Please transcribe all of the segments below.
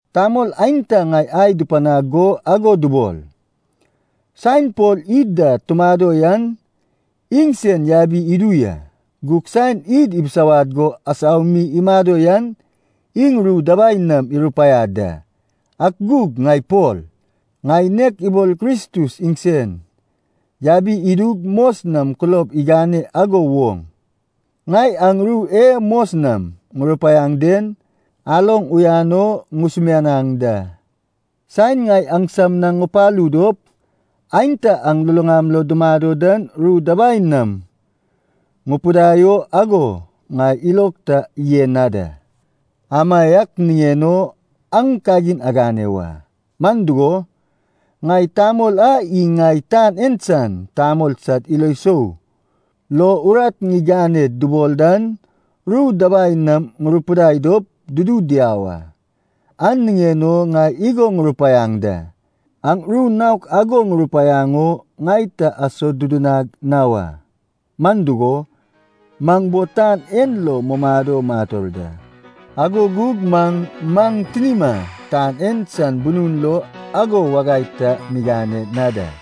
Tamol aenta ŋai ai dupanag go ago dubol, “Saen Pol id da tumado yan iŋsen yabi idu ya, gug saen id ibisawad go asau mi imado yan iŋ ru dabai nam irupaiad da.” Ak gug ŋai Pol, ŋai nek ibol Kristus iŋsen yabi idug mos nam kulob igane ago woŋ, ŋai aŋ ru e mos nam ŋurupaiaŋ den aloŋ uyan o ŋusumianaŋ da. Saen ŋai aŋsam na ŋupalu dop, aenta aŋ luluŋam lo dumado dan ru dabai nam ŋupidai o ago ŋai ilog ta yen na da. Amaiak niŋen o aŋ kagin agane wa, man dugo, ŋai tamol a iŋ ŋai tan en san tamol sad ilo sou lo urat ŋiganed dubol dan ru dabai nam ŋurupidai dop dudu diau a. An niŋen o ŋai igo ŋurupaiaŋ da, aŋ ru naok ago ŋupanaŋ o ŋai ta asodudunag na wa. Man dugo, maŋ bo tan en lo mumado mator da, ago gug man maŋ tinima tan en san bunun lo ago wagai ta migane na da.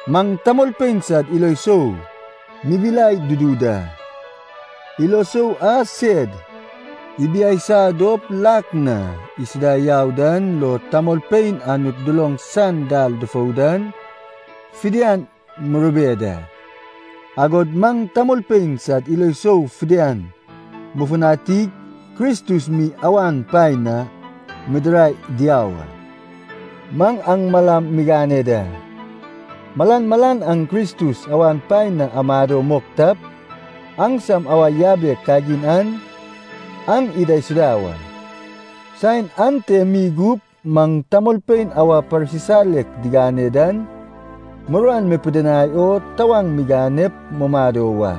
Maŋ tamolpein sad ilo sou mibilai dudu da. Ilo sou a sed ibiaisa dop lak na isuda yau dan lo tamolpein Anut duloŋ san dal dufou dan fidian murube da. Agod maŋ tamolpein sad ilo sou fidian mufutanig Kristus mi awan paen na midirai diau a. Maŋ aŋ malam migane da. Malan malan aŋ Kristus awan paen na amado mok tap, aŋsam awa yabek kagin an aŋ idaisuda wa. Saen ante mi gup maŋ tamolpein awa parsisalek digane dan muruan mipidinai o tawaŋ miganep mumado wa.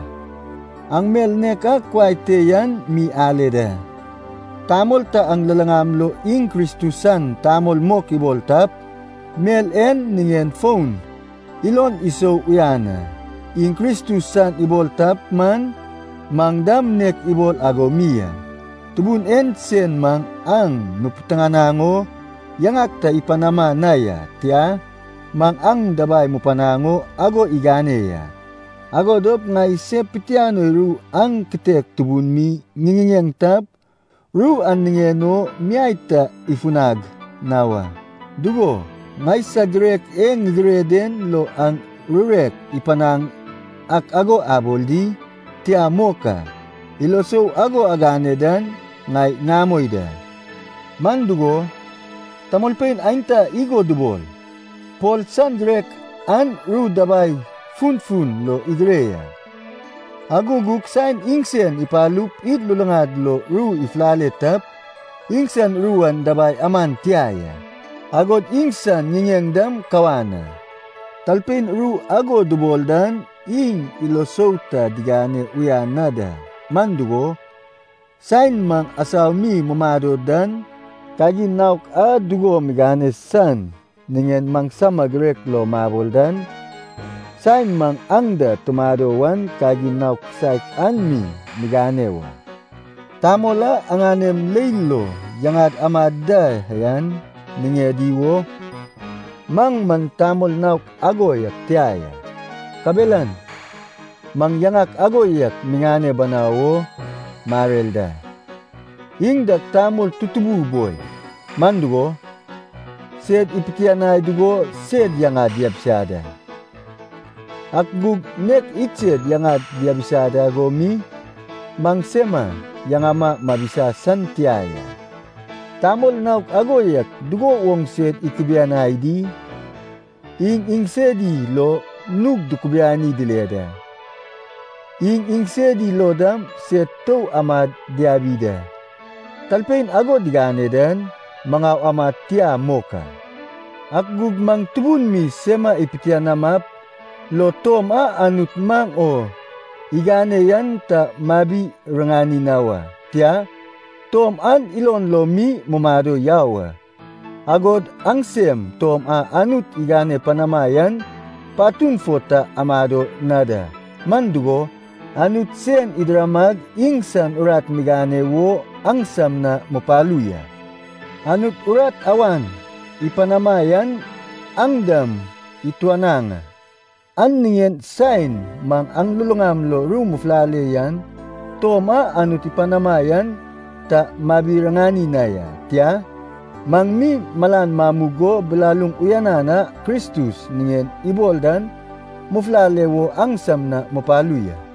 Aŋ mel nek a kuai te yan mi ale da. Tamol ta aŋ luluŋam lo iŋ Kristus san tamol mok ibol tap, mel en niŋen fon ilon isou uyan a. Iŋ Kristus san ibol tap man, maŋ dam nek iŋ ibol ago mi a. Tubun en sen maŋ aŋ mupitiŋinaŋ o yaŋak ta ipanama na ya, tia, maŋ aŋ dabai mupanaŋ o ago igane ya. Ago dop ŋai se pitianoi ru an kitek tubun mi ŋiŋiŋeŋ tap, ru an niŋen o miai ta ifunag na wa. Dugo, ŋaisag girek e ŋigire den lo aŋ rurek ŋupanaŋ ak ago abol di? Tia mok a. Ilo sou ago agane dan ŋai ŋamoi da. Man dugo, tamolpein aenta igo dubol, “Pol san girek an ru dabai funfun lo igire ya, ago gug saen iŋsen ipalup id luluŋad lo ru ifulale tap, iŋsan ru an dabai aman tia ya, agod iŋsan ŋiŋeŋ man kawan a.” Talpein ru ago dubol dan iŋ ilo sou ta digane uyan na da. Man dugo, saen maŋ asau mi mumado dan, kagin naok a dugo migane san niŋen maŋsama girek lo mabol dan, saen maŋ aŋ da tumado wan kagin naon kisaek an mi migane wa. Tamol a aŋanem leil lo yaŋad aman da yan niŋedi wo, maŋ man tamol naok ago yak tia ya. Kabelan maŋ yaŋak ago yak miŋane banau o marer da. Iŋ dag tamol tutubu boi, man dugo, sed ipitianai dugo sed yaŋad diabisa da. Ak gug nek iŋsed yaŋad diabisa ago mi, maŋsema yaŋama mabisa san tia ya. Tamol naok ago yak dugo woŋ sed ikubianai di? Iŋ iŋsedi lo nug dukubiani dile da, iŋ iŋsedi lo dam sed tou amad diabi da. Talpein ago digane dan maŋau amad tia mok a. Ak gug maŋ tubun mi sema ipitianamap, lo tom a Anut maŋ o igane yan ta mabi-riŋani na wa. Tia, tom an ilon lo mi mumado yau a. Agod aŋsem tom a Anut igane panama yan patun fo ta amado na da, man dugo, Anut sen idiramag iŋsan urat migane wo aŋsam na mupalu ya. Anut urat awan ipanama yan aŋ dam ituanaŋ a, an niŋen saen maŋ aŋ luluŋam lo ru mufulale yan tom a Anut ipanama yan ta mabi-riŋani na ya. Tia, maŋ mi malan mamug go bilaluŋ uyanan a Kristus niŋen ibol dan mufulale wo aŋsam na mupalu ya.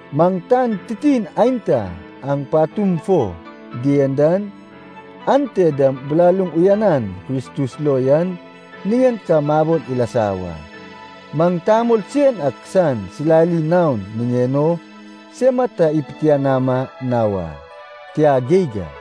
Maŋ tan titin aenta aŋ patum fo dien dan, ante dam bilaluŋ uyanan Kristus lo yan niŋen ka mabol ilasa wa. Maŋ tamol sen ak san silali naon niŋen o sema ta ipitianama na wa. Tia geig a.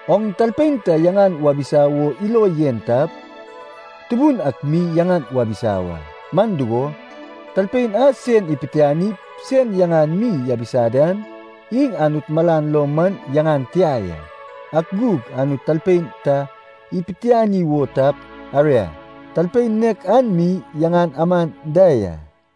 “Oŋ talpein ta yaŋan wabisa wo ilo yen tap, Tubun ak mi yaŋan wabisa wa.” Man dugo, talpein a sen ipitianip sen yaŋan mi yabisa dan, iŋ Anut malan lo man yaŋan tia ya. Ak gug Anut talpein ta ipitiani wo tap, aria, talpein nek an mi yaŋan aman da ya.